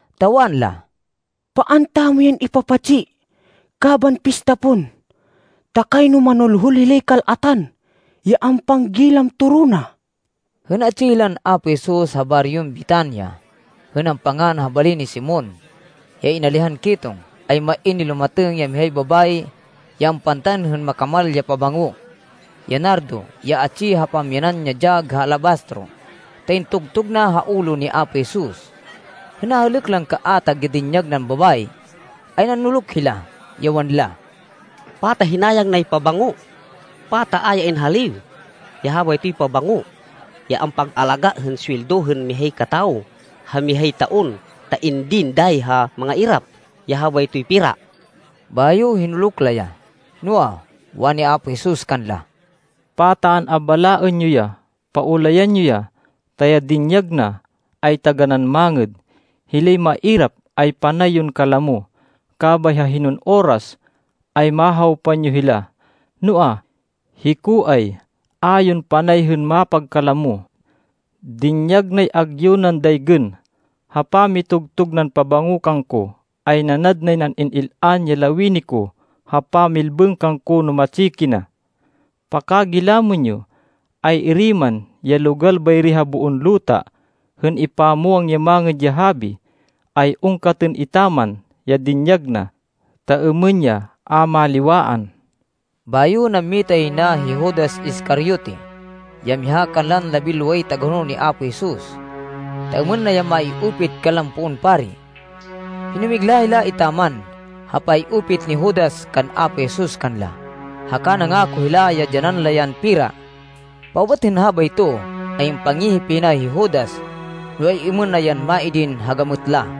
Ta wanla, “Paan tamo yan ipapatsi kaban pista pon, ta kayno manulhul hilay kal-atan, ya ampanggilam toro na.” Hên atsi hilan Apo Jesus ha baryon Betania, hên ampangan ha bali ni Simon, ya inalihan ketong, ay main nilumatêng ya mihay babayi, ya ampantan hên makamal ya pabango, ya nardo, ya atsi ha pamyanan ya dyag ha alabastro, ta intugtug na ha ulo ni Apo Jesus. Hên nahêlêk lan kaatag ya dinyag nan babayi, ay nanuluk hila, ya wanla, “Pata hinayang nay pabango? Pata a ya inhaliw ya habaytoy pabango, ya ampag-alaga hên suweldo hên mihay katawo ha mihay taon, ta indin dayi ha mangairap ya habaytoy pera?” Bayo hinuluk la ya. Noa, wani Apo Jesus kanla, “Pata an-abalaên yo ya! Paulayan yo ya, ta ya dinyag na, ay taganán mangêd. Hilay mairap ay panay yon kalamo, kabay ha hinon oras, ay mahawpan yo hila, noa, hiko ay a yon panay hên mapagkalamo. Dinyag nay agyu nan daygên. Ha pamitugtug nan pabango kangko, ay nanad nay nan in-il-an ya lawini ko ha pamilbêng kangko no matsi kina. Pakagilamên yo, ay-iri man ya logal bayri ha boon luta hên ipamwang ya Mangêd ya Habi, ay ungkatên etaman ya dinyag na, ta êmên ya a maliwaan.” Bayo nammita yay na hi Judas Iscariote, ya miha kanlan labinloway tagahonol ni Apo Jesus, ta êmên na ya mai-upit kanlan poon pari. Hinumigla hila etaman ha pay-upit ni Judas kan Apo Jesus kanla, haka nangako hila ya dyanan la yan pera. Paubat hên habayto, ay ampangihip yay na hi Judas no ay-êmên na yan maidin ha gamêt la.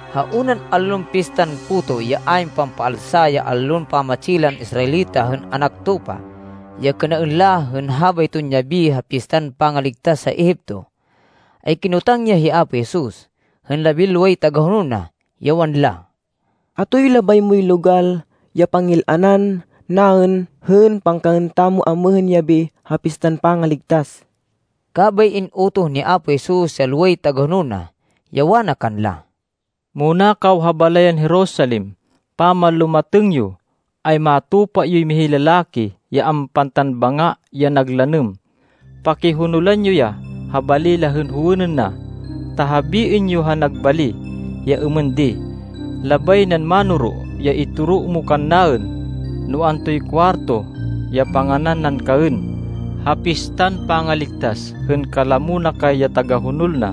Ha unan allon Pistan Puto ya ayn Pampaalsa ya allon pamatsi lan Israelita hên anak tupa, ya kênaên la hên habayton yabi ha Pistan Pangaligtas ha Egipto, ay kinotang ya hi Apo Jesus, hên labinloway tagahonol na, ya wanla, “Atoy labay moy logal ya pangil-anan naên hên pangkaên tamo amêhên yabi ha Pistan Pangaligtas?” Kabay in-utoh ni Apo Jesus ya loway tagahonol na, ya wana kanla, “Muna kaw ha balayan Jerusalem, pamanlumatêng yo, ay matupa yoy mihay lalaki ya ampantan banga ya nag lanêm. Pakihonolan yo ya ha bali ya howênên na, ta habiên yo ha nag bali, ya êmên di, ‘Labay nan Mánoro ya itoro mo kannaên, no antoy kuwarto ya panganan nan kaên ha Pistan Pangaligtas, hên kalamo na kay ya tagahonol na.’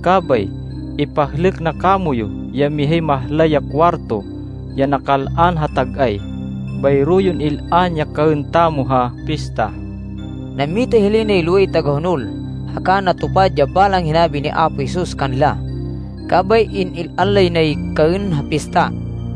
Kabay ipahlêk na kamoyu ya mihay mahlay ya kuwarto ya nakal-an ha tag-ay. Bayro yon il-an ya kaên tamo ha Pista.” Nammita hilay nay loway tagahonol, haka natupad ya balang hinabi ni Apo Jesus kanla. Kabay in-il-an lay nay kaên ha Pista.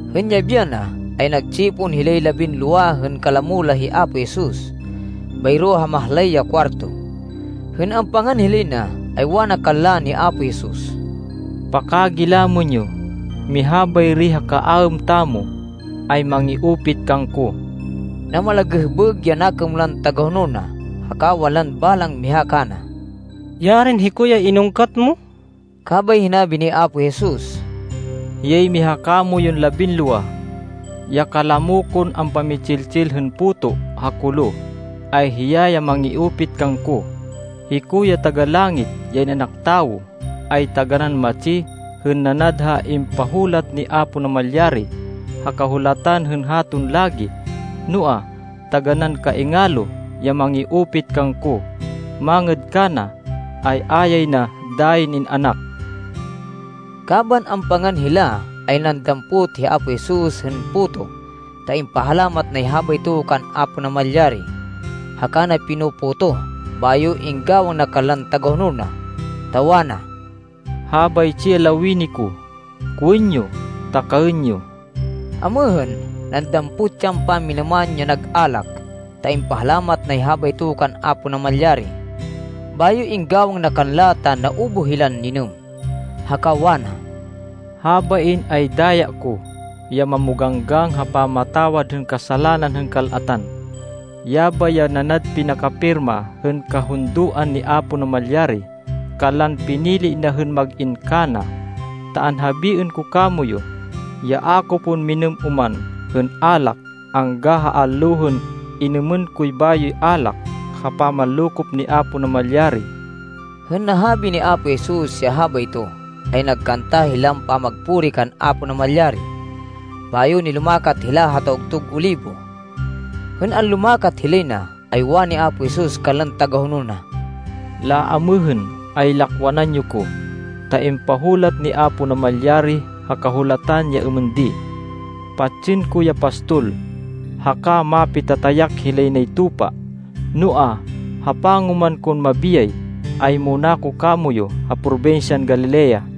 Hên yabi yana, ay nag-tsipon hilay labinlowa hên kalamo la hi Apo Jesus, bayro ha mahlay ya kuwarto. Hên ampangan hilay na, ay wana kanla ni Apo Jesus, “Pakagilamên yo, miha bayri ha kaaêm tamo, ay mangi-upit kangko.” Namalagêhbêg ya nakêm lan tagahonol na, haka wanlan balang miha kana, “Yarin hiko ya inungkat mo!” Kabay hinabi ni Apo Jesus, “Hiyay miha kamoyun labinlowa. Ya kalamo kon ampami-tsil-tsil hên puto ha kolo, ay hiya ya mangi-upit kangko. Hiko ya Taga-Langit, ya In-anak Tawo ay taganán matsi hên nanad ha impahulat ni Apo Namalyari ha Kahulatan hên haton lagi. Noa, taganán kaingalo ya mangi-upit kangko. Mangêd kana, ay a yay na dayin in-anak.” Kaban ampangan hila, ay nandampot hi Apo Jesus hên puto ta impahalamat nay habayto kan Apo Namalyari, haka na pino-potoh, bayo inggawang na kanlan tagahonol na, ta wana, “Habaytsi ya lawini ko, kowên yo ta kaên yo.” Amêhên, nandampot yan pamminêman ya nag alak, ta impahalamat nay habayto kan Apo Namalyari. Bayo inggawang na kanla ta naubuh hilan ninêm. Haka wana, “Habain ay daya ko, ya mamoganggang ha pamatawad hên kasalanan hên kal-atan. Yabay ya nanad pinakapirma hên kahundoan ni Apo Namalyari kanlan pinili na hên mag-in kana. Ta anhabiên ko kamoyu, ya a ko pon minêm oman hên alak, angga ha allo hên inumên koy bayoy alak ha pamanlokop ni Apo Namalyari.” Hên nahabi ni Apo Jesus ya habayto, ay nagkanta hilan pamagpuri kan Apo Namalyari, bayo nilumakat hila ha Tawgtug Olibo. Hên anlumakat hilay na, ay wani Apo Jesus kanlan tagahonol na, “Laamêhên ay lakwanan yo ko, ta impahulat ni Apo Namalyari ha Kahulatan, ya êmên di, ‘Patsên ko ya pastol, haka mapitatayak hilay nay tupa.’ Noa, ha pangoman kon mabiyay, ay muna ko kamoyu ha probinsyan Galilea.”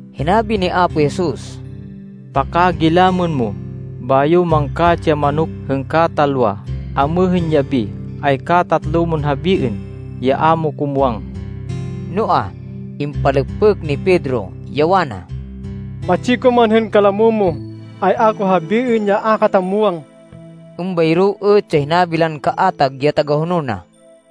Hinabi ni Apo Jesus, “Pakagilamên mo, bayo mangkatsi ya manok hên katalwa, amêhên yabi, ay katatlo mon habiên ya a mo ko muwang.” Noa, impalêkpêk ni Pedro, ya wana, “Matsi ko man hên kalamo mo, ay a ko habiên ya a kata muwang.” Êmbayro êt ya hinabi lan kaatag ya tagahonol na.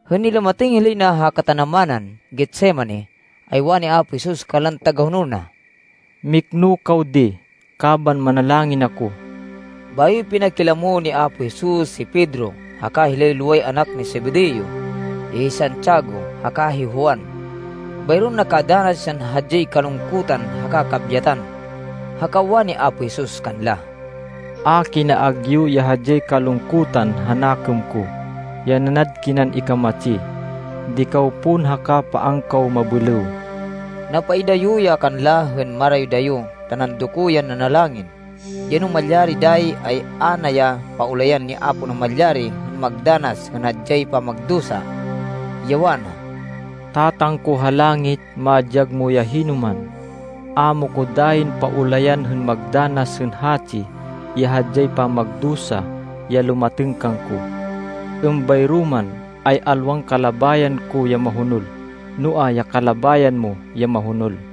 Hên nilumatêng hilay na ha katanamanan Getsemani, ay wani Apo Jesus kanlan tagahonol na, “Mikno kaw di kaban manalangin ako.” Bayo pinakilamo ni Apo Jesus hi Pedro, haka hilay loway anak ni Zebedeo, ya hi Santiago haka hi Juan. Bayron nakadanas yan hadyay kalungkutan haka kabyatan. Haka wani Apo Jesus kanla, “A kina agyu ya hadyay kalungkutan ha nakêm ko, ya nanad kinan ikamatsi. Di kaw pon haka paan kaw mabêlêw.” Napaidayo ya kanla hên marayo-dayo ta nandoko yan nanalangin, ya no malyari dayi, ay a na ya paulayan ni Apo Namalyari hên magdanas hên hadyay pamagdusa, ya wana, “Tatang ko ha langit, madyag mo ya hinoman. A mo ko dayin paulayan hên magdanas hên hatsi ya hadyay pamagdusa ya lumatêng kangko. Êmbayro man, ay alwan kalabayan ko ya mahonol, noa, ya kalabayan mo ya mahonol.”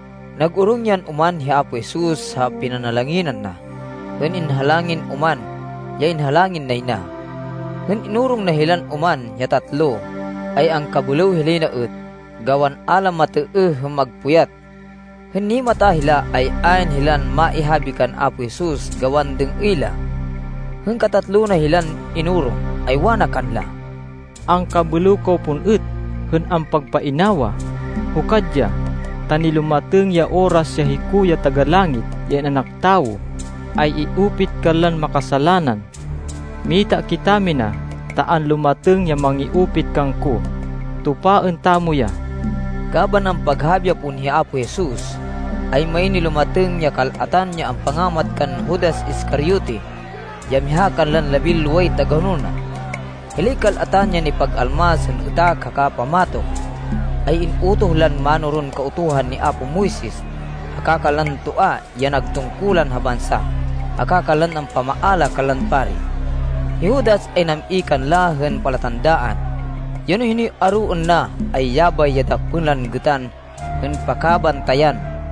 Nag-orong yan oman hi Apo Jesus ha pinanalanginan na, hên inhalangin oman, ya inhalangin nay na. Hên inorong na hilan oman ya tatlo, ay angkabêlêw hilay na êt, gawan a la matêêh hên magpuyat. Hên nimata hila, ay ayn hilan maihabi kan Apo Jesus gawan dêng-êy la. Hên katatlo na hilan inorong, ay wana kanla, “Angkabêlêw kaw pon êt hên ampagpainawa! Hukad ya! Ta nilumatêng ya oras ya hiko ya Taga-Langit, ya In-anak Tawo, ay i-upit kanlan makasalanan! Mita kitamina, ta anlumatêng ya mangi-upit kangko. Tupaên tamo ya!” Kaban ampaghabi ya pon hi Apo Jesus, ay main nilumatêng, ya kal-atan ya ampangamat kan Judas Iscariote ya miha kanlan labinloway tagahonol na. Hilay kal-atan ya nipag-almas hên êtak haka pamatok, ay in-utoh lan mánoron Kautuhan ni apo Moises, haka kanlan toa ya nag tungkulan ha bansa, haka kanlan ampamaala kanlan pari. Hi Judas ay nam-i kanla hên palatandaan, ya no hinoy aroên na, ay yabay ya dakpên lan gêtan hên pakabantayan.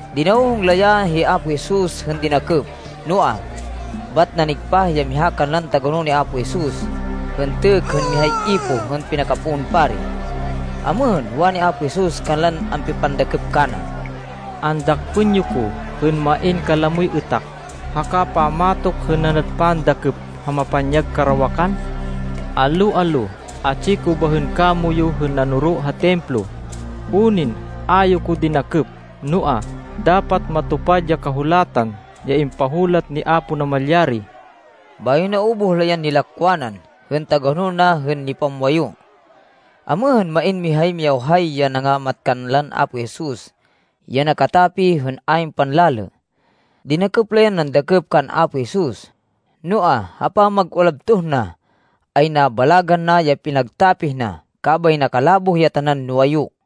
Dinawhong la ya hi Apo Jesus hên dinakêp. Noa, bat nanigpah ya miha kanlan tagahonol ni Apo Jesus, hên têkk hên mihay ipoh hên pinakapoon pari. Amêhên, wani Apo Jesus kanlan ampipandakêp kana, “Andakpên yo ko hên main kalamoy êtak haka pammatok hên nanad pandakêp ha mapanyag karawakan. Allo-allo atsi ko bahên kamoyu hên nanoro ha Templo, unin a yo ko dinakêp. Noa, dapat matupad ya Kahulatan ya impahulat ni Apo Namalyari.” Bayo naubuh la yan nilakwanan hên tagahonol na hên nipamwayu. Amêhên, main mihay miyawhay ya nangamat kanlan Apo Jesus, ya nakatapih hên ayn panlalê. Dinakêp la yan nandakêp kan Apo Jesus, noa, ha pamag-ulabtoh na, ay nabalagan na ya pinagtapih na, kabay nakalaboh ya tanan nuwayu.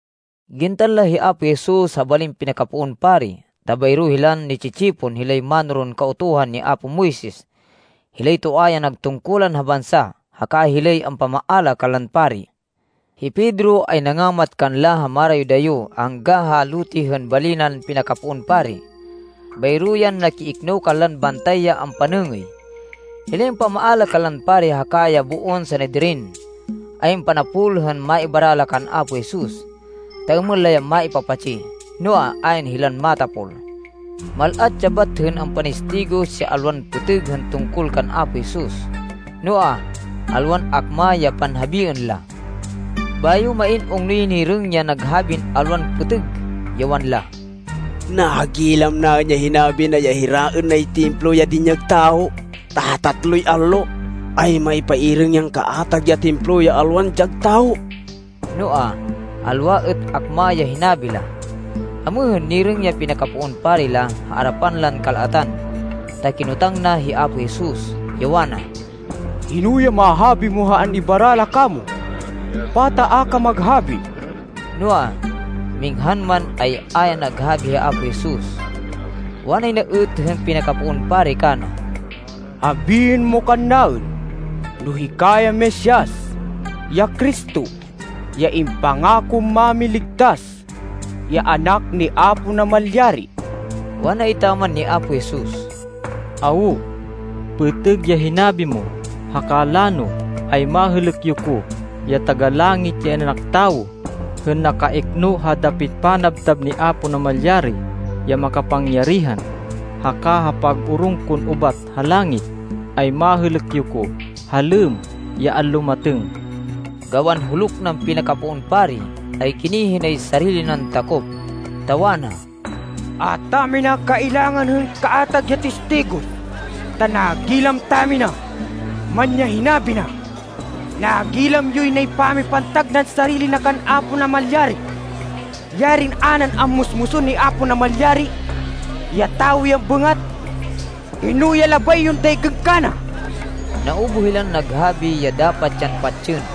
Gintan la hi Apo Jesus ha balin pinakapoon pari. Ta bayro hilan ni-tsi-tsipon hilay mánoron Kautuhan ni apo Moises, hilay toa ya nag tungkulan ha bansa, haka hilay ampamaala kanlan pari. Hi Pedro ay nangamat kanla ha marayo-dayo angga ha lote hên bali nan pinakapoon pari. Bayro yan nakiikno kanlan bantay ya ampanêngêy. Hilay ampamaala kanlan pari haka ya boon Sanedrin, ay ampanapol hên maibara la kan Apo Jesus, ta êmên la ya maipapatsi. Noa, ayn hilan matapol. Mal-at ya bat hên ampanistigos ya alwan pêtêg hên tungkol kan Apo Jesus, noa, alwan akma ya panhabiên la. Bayo main ungnoy nirêng ya naghabin alwan pêtêg, ya wanla, “Nagilam naên ya hinabi na ya hiraên nay Templo ya dinyag tawo, ta ha tatloy allo, ay maypairêng yan kaatag ya Templo ya alwan dyag tawo.” Noa, alwa êt akma ya hinabi la. Amêhên, nirêng ya pinakapoon pari la ha arapan lan kal-atan, ta kinotang na hi Apo Jesus, ya wana, “Hino ya mahabi mo ha an-ibara la kamo? Pata a ka maghabi?” Noa, minghan man, ay a ya naghabi hi Apo Jesus. Wanay na êt hên pinakapoon pari kana, “Habiên mo kannaên no hika ya Mesias, ya Cristo, ya impangakon Mámiligtas, ya Anak ni Apo Namalyari.” Wana etaman ni Apo Jesus, “Awo, pêtêg ya hinabi mo. Haka lano, ay mahêlêk yo ko, ya Taga-Langit, ya In-anak Tawo, hên nakaikno ha dapit panabtab ni Apo Namalyari ya Makapangyarihan. Haka ha pag-orong kon ubat ha langit, ay mahêlêk yo ko ha lêmm ya anlumatêng.” Gawan huluk nan pinakapoon pari, ay ginihi nay sarili nan takop, ta wana, “A tamina kailangan hên kaatag ya tistigos, ta nagilam tamina man ya hinabi na. Nagilam yoy nay pamipantag nan sarili na kan Apo Namalyari! Yarin a nan ammusmusên hi Apo Namalyari ya tawo yan bêngat! Hino ya labay yon daygên kana?” Naubuh hilan naghabi ya dapat yan patsên.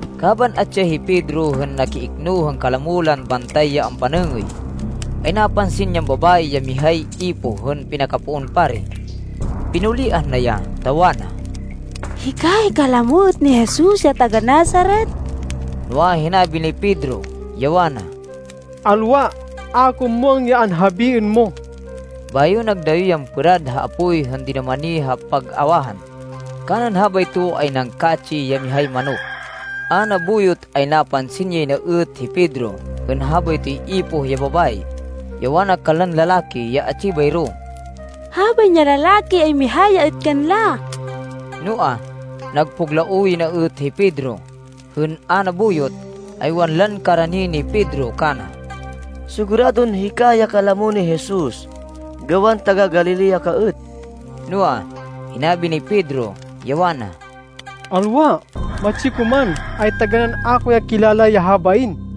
Kaban atsi ya hi Pedro hên nakiikno hên kalamo lan bantay ya ampanêngêy, ay napansin yan babayi ya mihay ipoh hên pinakapoon pari. Pinuliah na ya, ta wana, “Hika ay kalamo êt ni Jesus ya taga-Nazaret.” Noa, hinabi ni Pedro, ya wana, “Alwa. A ko muwang ya anhabiên mo.” Bayo nagdayo yan pêrad ha apoy hên dinumani ha pag-awahan. Kanan habayto ay nangkatsi ya mihay manok. A nabuyot ay napansin yay na êt hi Pedro, hên habaytoy ipoh ya babayi, ya wana kanlan lalaki ya atsi bayro, “Habain ya lalaki, ay miha ya êt kanla!” Noa, nagpuglaoh yay na êt hi Pedro. Hên a nabuyot, ay wanlan karani ni Pedro kana, “Siguradon hika ya kalamo ni Jesus, gawan taga-Galilea ka êt.” Noa, hinabi ni Pedro, ya wana, “Alwa! Matsi ko man, ay taganán a ko ya muwang ya habain!”